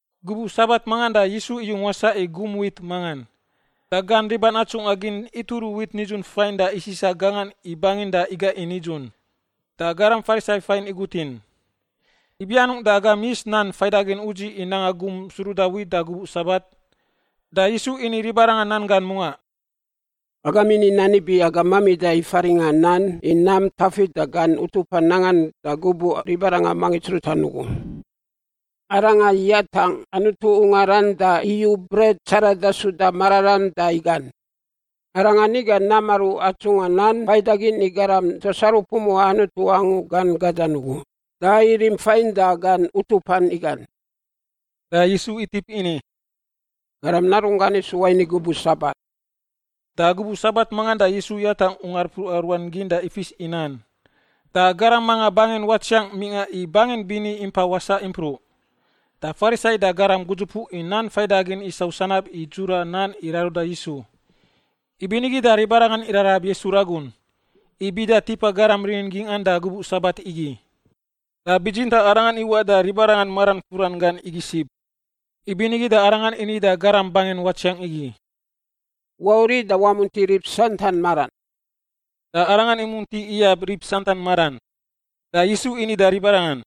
Gubuꞌ Sabat mangan da Yisu iyung wasaꞌ i gum wit mangan. Da gan riban atsungꞌa gin ituru wit nidzun fain da isisa gangan i bangin da iga i nidzun. Da garam Farisai fain igutin, “Ibi anungꞌ da agam yis nan faidagin udziꞌ i nanga gum suruda wit da gubuꞌ Sabat?” Da Yisu ini ribarangan nan gan mungaꞌ, “Agam ini nan ibi agam mamida i faringꞌa nan i nam Tafit da gan utupan nangan da gubuꞌ ribarangan mangits rutan ugu. Arangan yatangꞌ Anutu ungaran da iyu bret tsarada suda mararam da igan. Arangan iga nam aru atsungꞌa nan faidagin i garam tuas aru pumuꞌa Anutu angu gan gadan ugu, da irim fain da gan utupan igan.” Da Yisu itip ini, “Garam Narunggan isu wain i gubuꞌ Sabat.” Da gubuꞌ Sabat mangan da Yisu yatangꞌ ungar mpruꞌa ruan gin da ifis i nan. Da garam manga bangin watsiang mingꞌa i bangin bini impa wasaꞌ impruꞌ. Da Farisai da garam gudzupuꞌ i nan faidagin isau sanab i dzura nan i raruda Yisu. Ibinigi da ribarangan irarab Yisu ragun, i bida tipa garam rinin gingꞌan da gubuꞌ Sabat igi. Da bitsintaꞌ Arangan iwaꞌ da ribarangan maran furan gan igi sib. Ibinigi da Arangan ini da garam bangin watsiang igi, “Wauriꞌ da wamunti rib santan maran.” Da arangan imunti iyab rib santan maran. Da Yisu ini da ribarangan,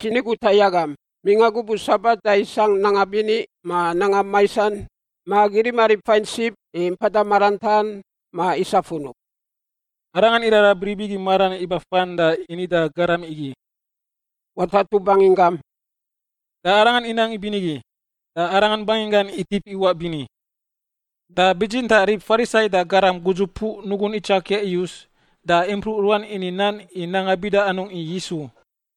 “Dzi ni guta i agam, mingꞌa gubuꞌ Sabat da isangꞌ nanga bini ma nanga maisan, ma agi rima rib fain sib i mpada marantaꞌan ma isa funub?” Arangan irarab rib igi maran iba fan da ini da garam igi, “Watatu banginggam,” da arangan inang ibinigi, da arangan banginggan itip iwaꞌ bini. Da bitsintaꞌ rib Farisai da garam gudzupuꞌ nugun itsakia iyus da impruꞌ ruan ini nan i nanga bida anungꞌ i Yisu.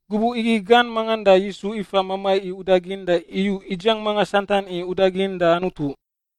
Gubuꞌ igi gan mangan da Yisu ifa mamai i udagin da iyu idziang manga santan i udagin da Anutu.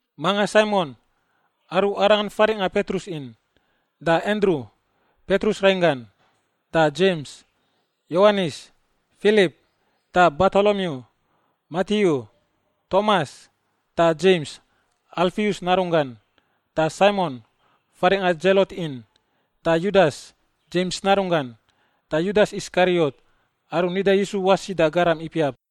manga Saimon (aru Arangan faringꞌa Petrus in) da Andru (Petrus rainggan), da Dzems, Yowanis, Filip, da Bartolomiu, Matiu, Tomas, da Dzems (Alfius narunggan), da Saimon (faringꞌa Dzelot in), da Yudas (Dzems narunggan), da Yudas Iskariot (aru nida Yisu wasi da garam ipiap).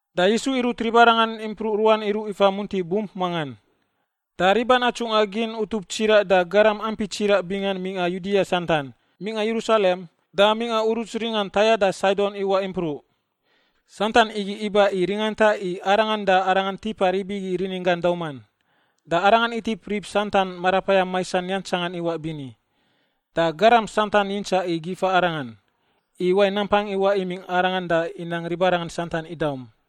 Da Yisu irut ribarangan impruꞌ ruan iruꞌ ifa munti bump mangan. Da riban atsungꞌa gin utup tsiraꞌ da garam ampi tsiraꞌ bingan mingꞌa Yudia santan, mingꞌa Yerusalem, da mingꞌa uruts ringan Taia da Saidon iwaꞌ impruꞌ. Santan igi iba i ringanta i Arangan da Arangan tipa rib igi rininggan dauman. Da Arangan itip rib santan marapayam maisan yantsangan iwaꞌ bini. Da garam santan yintsaꞌ i gifa Arangan, i wain nampang iwaꞌ imingꞌ Arangan da inang ribarangan santan idaum.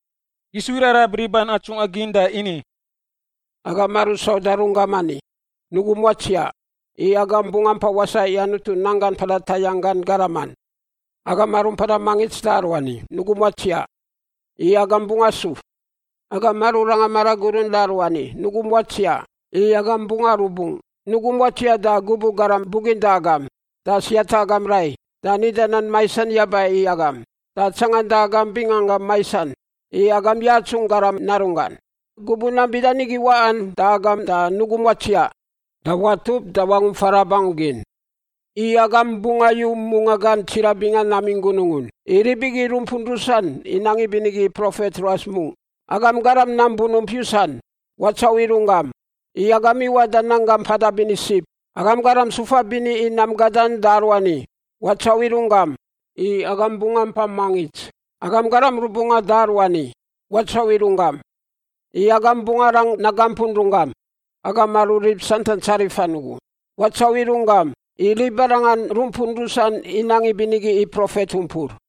Yisu irarab riban atsungꞌa gin da ini, “Agam aru sauda runggam ani, nugum watsiaꞌ, i agam bungꞌ ampa wasaꞌ i Anutu nanggan mpada tayangꞌ gan garaman. Agam aru mpada mangits da aruani, nugum watsiaꞌ, i agam bungꞌ asuf. Agam aru ranga maragurun da aruani, nugum watsiaꞌ, i agam bungꞌ arubungꞌ. Nugum watsiaꞌ da gubuꞌ garam buginda agam da siata agam rai da nida nan maisan yaba i agam da tsanganda agam binganggam maisan i agam yatsungꞌ Garam Narunggan. Gubuꞌ nam bida nigi waꞌan da agam da nugum watsiaꞌ da watup da wangump farab angu gin. I agam bungꞌ ayu mungaꞌ gan tsiraꞌ bingan namingꞌ gunungun. I rib igi rumpun rusan inang ibinigi i profet ruas mungꞌ. Agam garam nam bunump yusan, watsauꞌ i runggam, i agam iwaꞌ da nanggam mpada bini sib. Agam garam sufa bini i nam gadan da aruani, watsauꞌ i runggam, i agam bungꞌ ampa mangits. Agam garam rubungꞌan da aruani, watsauꞌ i runggam, i agam bungꞌ arang nagampun runggam. Agam aru rib santan tsarifan ugu, watsauꞌ i runggam, i ribarangan rumpun rusan inang ibinigi i profet umpur.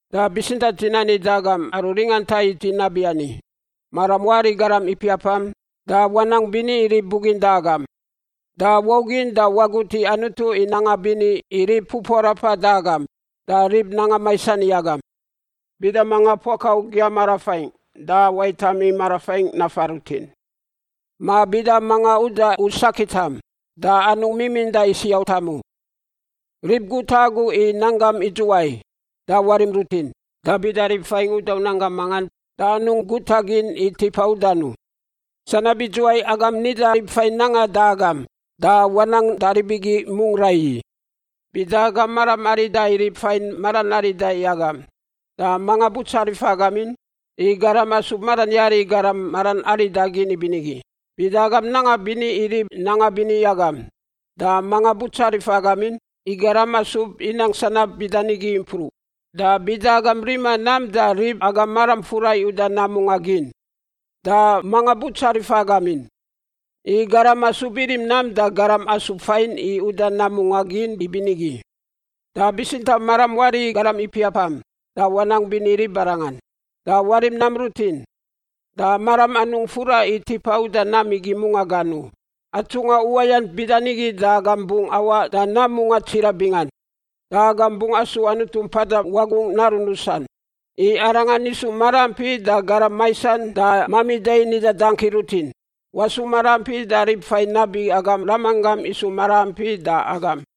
“Da bitsintaꞌ dzi nani da agam aru ringanta i dzi nabiani: Maram wari i garam ipiapam, da wanang bini i rib buginda agam. Da waugin da wagut i Anutu i nanga bini i rib pupuarapan da agam da rib nanga maisan i agam. Bida manga puaka u giyam marafaingꞌ da waitam i marafaingꞌ nafa rutin, ma bida manga uda u saketam, da anungꞌ miminda i siotam u. Rib guta agu i nanggam idzuwai da warim rutin. Da bida rib fain uda u nanggam mangan da anungꞌ guta gin i tipa udan u. Sanab idzuwai agam nida rib fain nangan da agam, da wanang da rib igi mungꞌ raiyi. “Bida agam maram arida i rib fain maran arida i agam, da manga butsarifa agam in? I garam asub maran yari i garam maran arida gin ibinigi. Bida agam nanga bini i rib nanga bini i agam, da manga butsarifa agam in? I garam asub inang sanab bida nigi impruꞌ. Da bida agam rima nam da rib agam maram fura i uda nam mungaꞌ gin, da manga butsarifa agam in? I garam asub irim nam da garam asub fain i uda nam mungaꞌ gin ibinigi. Da bitsintaꞌ maram wari i garam ipiapam, da wanang bini i ribarangan. Da warim nam rutin, da maram anungꞌ fura i tipa uda nam igi mungaꞌ gan u. Atsungꞌa uwayant bida nigi da agam bungꞌ awaꞌ da nam mungaꞌ tsiraꞌ bingan, da agam bungꞌ asu Anutu Mpada Wagungꞌ narun rusan, i Arangan isu maraampi da garam maisan da mamida i nida dangki rutin. Wasu maraampi da rib fain nabi agam Ramanggam isu maraampi da agam.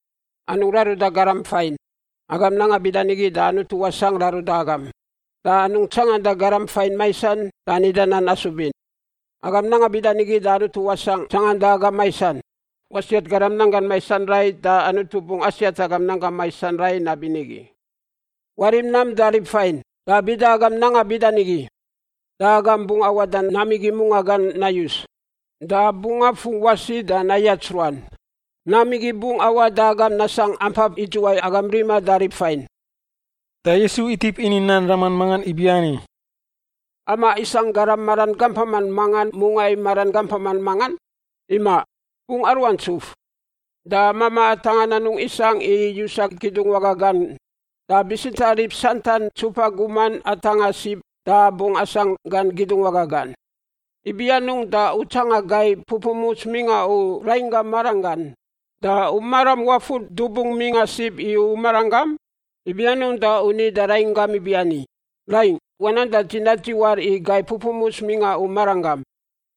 “Anungꞌ raruda garam fain; agam nanga bida nigi da Anutu wasangꞌ raruda agam. Da anungꞌ tsanganda garam fain maisan da nida nan asubin; agam nanga bida nigi da Anutu wasangꞌ tsanganda agam maisan. Wasiat garam fain nanggan maisan rai da Anutu bungꞌ asiat agam nanggam maisan rai nabinigi. Warim nam da rib fain, da bida agam nanga bida nigi, da agam bungꞌ awaꞌ da nam igi mungaꞌ gan nayus, da bungꞌ afungꞌ wasi da nayats ruan. Nam igi bungꞌ awaꞌ da agam nasangꞌ ampap idzuwai agam riman da rib fain.” Da Yisu itip ini nan raman mangan ibiani, “Amaꞌ, isangꞌ garam maran gampaman mangan mungꞌa i maran gampaman mangan? Imaꞌ! Bungꞌ aruaꞌ ntsuf! Da mamaꞌ atangꞌan anungꞌ isangꞌ i yusa kidungwaga gan. Da bitsintaꞌ rib santan ntsupa guman atangꞌan sib da bungꞌ asangꞌ gan kidungwaga gan. Ibi anungꞌ da u tsanga gai pupumuts mingꞌa u rainggam maranggan, da u maram wafur dubung mingꞌa sib i u maranggam? Ibi anungꞌ da u ni da rainggam ibiani, ‘Raingꞌ, wanang da dzi nadziwar i gai pupumuts mingꞌa u maranggam,’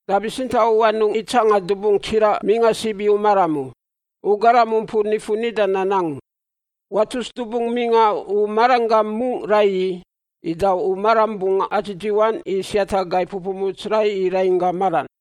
da bitsintaꞌ u anungꞌ itsangan dubung tsiraꞌ mingꞌa sib i u maram u? U garam umpur nifun nida nan angu, watus dubung mingꞌa u maranggam mungꞌ raiyi, ida u maram bungꞌ adzidziwan i siata gai pupumuts rai i rainggam maran.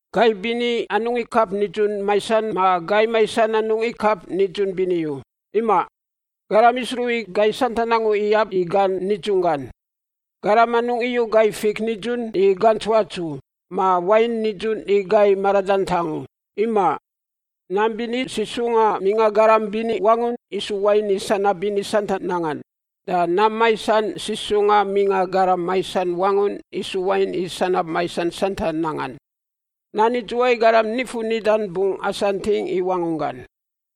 “Gai bini anungꞌ ikap nidzun maisan ma gai maisan anungꞌ ikap nidzun bini u, imaꞌ. Garam isruꞌ i gai santan angu iyab i gan nidzunggan. Garam anungꞌ iyu gai fik nidzun i gantsuats u, ma wain nidzun i gai maradantang u. Imaꞌ. Nam bini sisungꞌa mingꞌa garam bini wangun isu wain i sanab bini santan nangan. Da nam maisan sisungꞌa mingꞌa garam maisan wangun isu wain i sanab maisan santan nangan. Nan idzuwai garam nifun nidan bungꞌ asanting i wangunggan.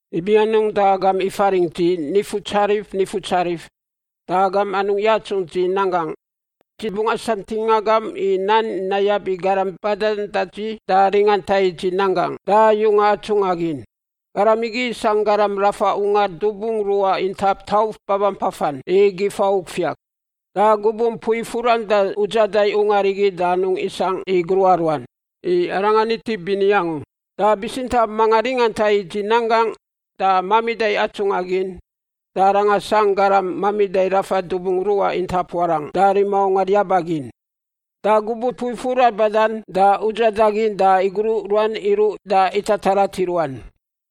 “Ibi anungꞌ da agam ifaringꞌ dzi, ‘Nifutsarif, Nifutsarif,’ da agam anungꞌ yatsungꞌ dzi nan gangꞌ? Dzi bungꞌ asantingꞌ agam i nan nayab i garam badan da dzi da ringanta i dzi nan gangꞌ da yunga atsungꞌa gin. Garam igi isangꞌ garam rafa ungar dubung ruꞌa intap tauf babampafan i gifa ufiak. Da gubuꞌ mpui furan da udzada i ungar igi da anungꞌ isangꞌ i gruꞌa ruan, i arangan itip bini angu. Da bitsintaꞌ manga ringanta i dzi nan gangꞌ da mamida i atsungꞌa gin da aranga sangꞌ garam mamida rafa dubung ruꞌa intap warangꞌ da rima ungar yaba gin. Da gubuꞌ mpui furan badan da udzada gin, da igruꞌ ruan iruꞌ da itatarat i ruan.”